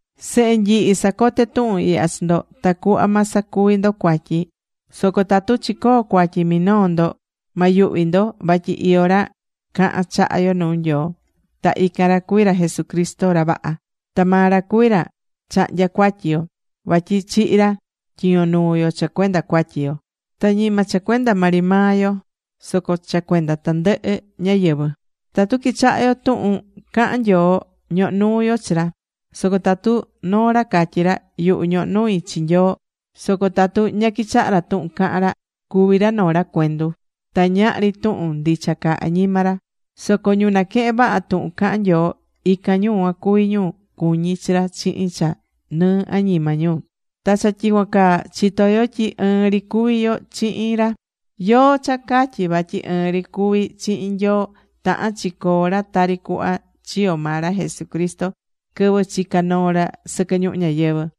Sehe nyihi, sacoté tuhun ihya chi ndo, tacuhva ma sacuvi ndo cuatyi. Soco tatu chicoo̱ cuatyi minoo ndo, ma yuhvi ndo, vatyi iyó ra cahán chaha yo nuu Nyoo. Ta ican ra cuví ra Jesucristo, ra vaha. Ta maa ra cuví ra chahnyá cuatyi yo, vatyi chihi̱ ra tyiño nuu yo cha cuenda cuatyi yo. Ta ñima cha cuenda maa ri maa yo, soco cha cuenda tandɨhɨ ñáyɨvɨ. Tatu quichahá yo tuhun cahán Nyoo, ñohó nuu yo chi ra. Soco tatu noo ra catyí ra: “Yuhu, ñohó nui chi Nyoo”, soco tatu ña quichahá ra tuhun cahán ra, cuví ra noo ra cuendu. Ta ñahri tuhun ndicha caá añima ra. Soco ñu naquehén vaha tuhun cahán Nyoo, ican ñu cuan cuví ñu cuñí chi ra chihin cha nɨɨ añima ñu. Ta cha tyicuan caa chitó yo tyi ɨɨn ri cuví yo chihin ra. Yóó cha catyí vatyi ɨɨn ri cuví chihin Nyoo, tahán chi coo ra tari cuhva chiyo̱ maa ra Jesucristo quɨvɨ chica̱ noo ra sɨquɨ ñuhu ñayɨvɨ̱.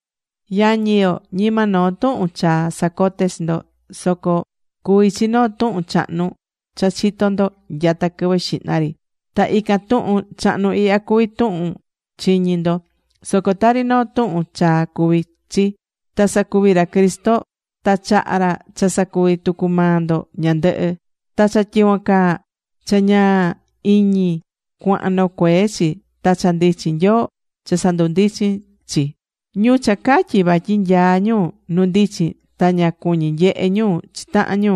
Yañi yo, ñima noo tuhun chaa sacoté chi ndo, soco cuví chi noo tuhun chahnu cha chitó ndo nyata quɨvɨ xihna ri. Ta ican tuhun chahnu ihya cuví tuhun chiñi̱ ndo. Soco tari noo tuhun chaa cuví chi. Ta sacuví ra Cristo, ta chaha̱ ra cha sacuví tucu maa ndo ñandɨhɨ. Ta cha tyicuan caa, cha ñaa iñi cuahan nocuee chi. Ta cha ndichin Nyoo cha sandundichín chi. Ñu cha catyí vatyi nyaá ñu nu ndichin, ta ña cuñí nyehe ñu chi tahan ñu,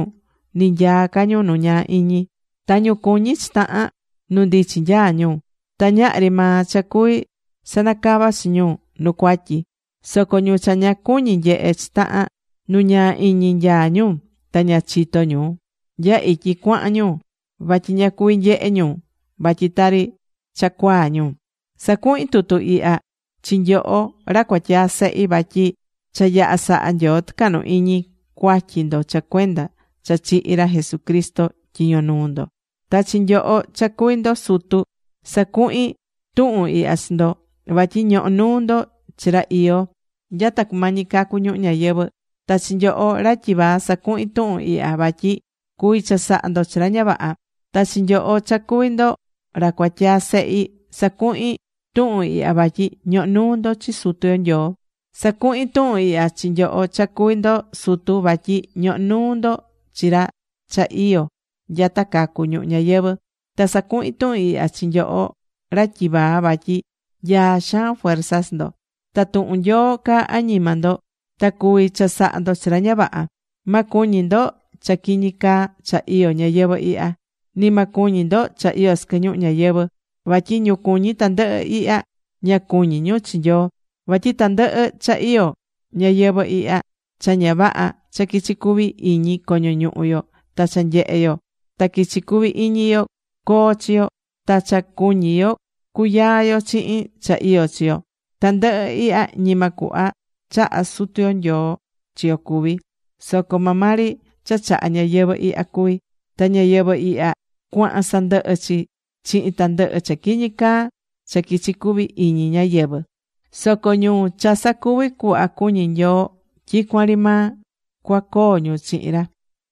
ni nyaá ca ñu nu ñaa iñi. Ta ñu cuñí chi tahan, nu ndichin nyaá ñu. Ta ñahri maa cha cuví sanacava chi ñu nu cuatyi. Soco ñu cha ña cuñí nyehe chi tahan, nu ñaa iñi nyaá ñu. Ta ña chitó ñu nya ityi cuahan ñu vatyi ña cuví nyehe ñu vatyi tari cha cuaa ñu. Sacuhín tuhun ihya chi nyoho, ra cuatyaa sehi. Vatyi cha yaha̱ saha Nyoo tɨcahnu iñi cuatyi ndo cha cuenda cha chihi̱ ra Jesucristo tyiño nuu ndo. Ta chi nyoho, cha cuví ndo sutu, sacuhín tuhun ihya chi ndo, vatyi ñohó nuu ndo chi ra iyó nyata cumañi cacu ñuhu ñayɨvɨ̱́. Ta chi nyoho, ra tyivaa, sacuhín tuhun ihya vatyi cuví chasaha ndo chi ra ña vaha. Ta chi nyoho, cha cuví ndo ra cuatyaa sehi, sacuhín tuhun ihya vatyi ñohó nuu ndo chi Sutu yo Nyoo. Sacuhín tuhun ihya chi nyoho cha cuví ndo sutu, vatyi ñohó nuu ndo chi ra cha iyó nyata cacu ñuhu ñayɨvɨ̱. Ta sacuhín tuhun ihya chi nyoho ra tyivaa vatyi nyaá xaan fuerza chi ndo. Ta tuhun Nyoo caá añima ndo. Ta cuví chasaha ndo chi ra ña vaha. Ma cuñi ndo cha quiñi caa cha iyó ñayɨvɨ̱ ihya. Ni ma cuñi ndo cha iyó sɨquɨ ñuhu ñayɨvɨ̱. Vatyi ñu cuñí tandɨhɨ ihya, ña cuñí ñu chi Nyoo. Vatyi tandɨhɨ cha iyó ñayɨvɨ̱ ihya, cha ña vaha cha quichi cuvi iñi coño ñuhu yo, ta cha nyehe yo ta quichi cuvi iñi yo coo chi yo, ta cha cuñi yo cuyaa yo chihin cha iyó chi yo, tandɨhɨ ihya ñima cuhva chahá Sutu yo Nyoo chi yo cuví, soco maa maa ri cha chahá ñayɨvɨ̱ ihya cuví. Ta ñayɨvɨ̱ ihya cuahan sandɨhɨ chi, chihin tandɨhɨ cha quiñi caa cha quichi cuvi iñi ñáyɨvɨ. Soco ñu cha sacuví cuhva cuñí Nyoo, tyicuan ri maa cuacoo ñu chihin ra.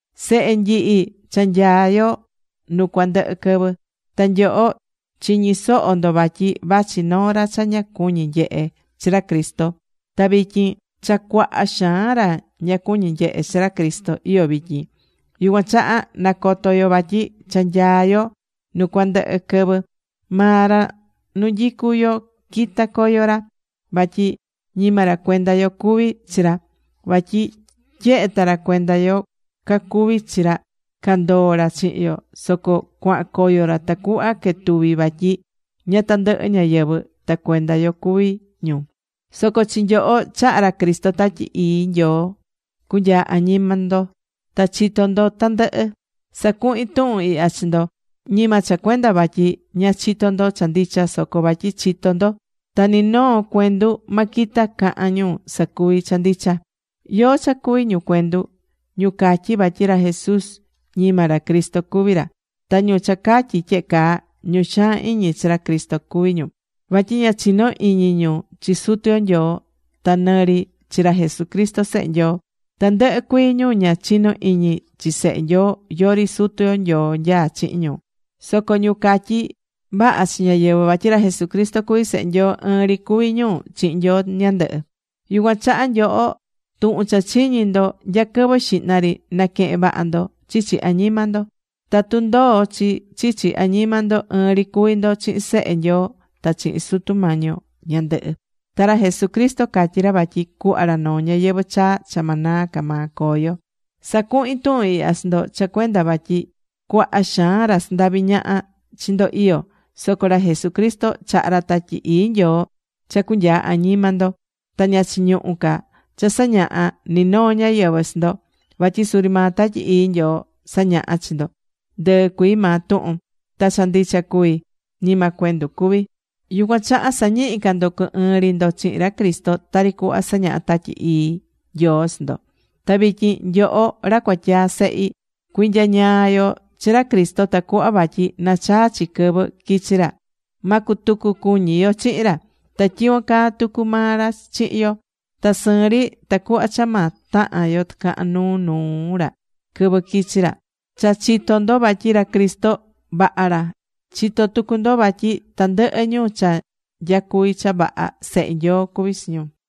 Sehe nyihi, cha nyaá yo nu cuandɨhɨ quɨvɨ. Ta nyoho chiñi̱ soho ndo vatyi vachi noo ra cha ña cuñí nyehe chi ra Cristo, ta vityin cha cuaha xaan ra ña cuñí nyehe chi ra Cristo iyó vityin. Yucuan chaha nacoto yo vatyi cha nyaá yo nu cuandɨhɨ quɨvɨ. Maa ra nu nyicú yo quita̱ coyo ra, vatyi ñima ra cuenda yo cuví chi ra. Vatyi tyehe ta ra cuenda yo cacuví chi ra, candoó ra chihin yo. Soco cuahan coyo ra tacuhva quetuvi vatyi ña tandɨhɨ ñáyɨvɨ ta cuenda yo cuví ñu. Soco chi nyoho chaha̱ ra Cristo Tatyi Ii Nyoo cunyaa añima ndo. Ta chitó ndo tandɨhɨ. Sacuhín tuhun ihya chi ndo ñima cha cuenda vatyi ña chitó ndo cha ndicha, soco vatyi chitó ndo. Ta ni noo cuendu ma quita cahan ñu sacuví cha ndicha. ¿Yóó cha cuví ñu cuendu? Ñu catyí vatyi ra Jesus ñima ra Cristo cuví ra. Ta ñu cha catyí tyehe caa, ñu xaan iñi chi ra Cristo cuví ñu. Vatyi ña chinó iñi ñu chi Sutu yo Nyoo, ta nɨ ri chi ra Jesucristo Sehe Nyoo. Tandɨhɨ cuii ñu ña chinó iñi chi Sehe Nyoo, yori Sutu yo Nyoo nyaá chihin ñu. Soco ñu catyí vaha chi ñáyɨvɨ vatyi ra Jesucristo cuví Sehe Nyoo, ɨɨn ri cuví ñu chihin Nyoo ñandɨhɨ. Yucuan chaha nyoho, tuhun cha chiñi̱ ndo nya quɨvɨ xihna ri, naquehe̱n vaha ndo chichi añima ndo. Tatu ndoó chi chichi añima ndo, ɨɨn ri cuví ndo chihin Sehe Nyoo ta chihin Sutu yo Nyoo ñandɨhɨ. Ta ra Jesucristo catyí ra vatyi cuhva ra noo ñayɨvɨ̱ chaa cha ma naa ca maa coo yo. Sacuhín tuhun ihya chi ndo cha cuenda vatyi cuaha xaan ra sandaví ñaha chi ndo iyó. Soco ra Jesucristo chaha̱ ra Tatyi Ii Nyoo cha cunyaa añima ndo, ta ña chiñuhú ca cha sañaha ni noo ñáyɨvɨ chi ndo. Vatyi suri maa Tatyi Ii Nyoo sañahá chi ndo ndɨɨ cuii maa tuhun. Ta cha ndicha cuví, ñima cuendu cuví. Yucuan chaha sa̱ñihi ca ndo cu ɨɨn ri ndo chihin ra Cristo tari cuhva sañahá Tatyi Ii Nyoo chi ndo. Ta vityin nyoho, ra cuatyaa sehi, cui̱nyañaa yo chi ra Cristo tacuhva vatyi nachaa chi quɨvɨ quichi ra, ma cutucu cuñi yo chihin ra. Ta tyicuan caa tucu maa ra chihin yo. Ta sɨɨn ri tacuhva cha ma tahan yo tɨcahan nuu nuu ra quɨvɨ quichi ra. Cha chitó ndo vatyi ra Cristo vaha ra. Chitó tucu ndo vatyi tandɨhɨ ñu cha nyacuví cha vaha, sehe Nyoo cuví chi ñu.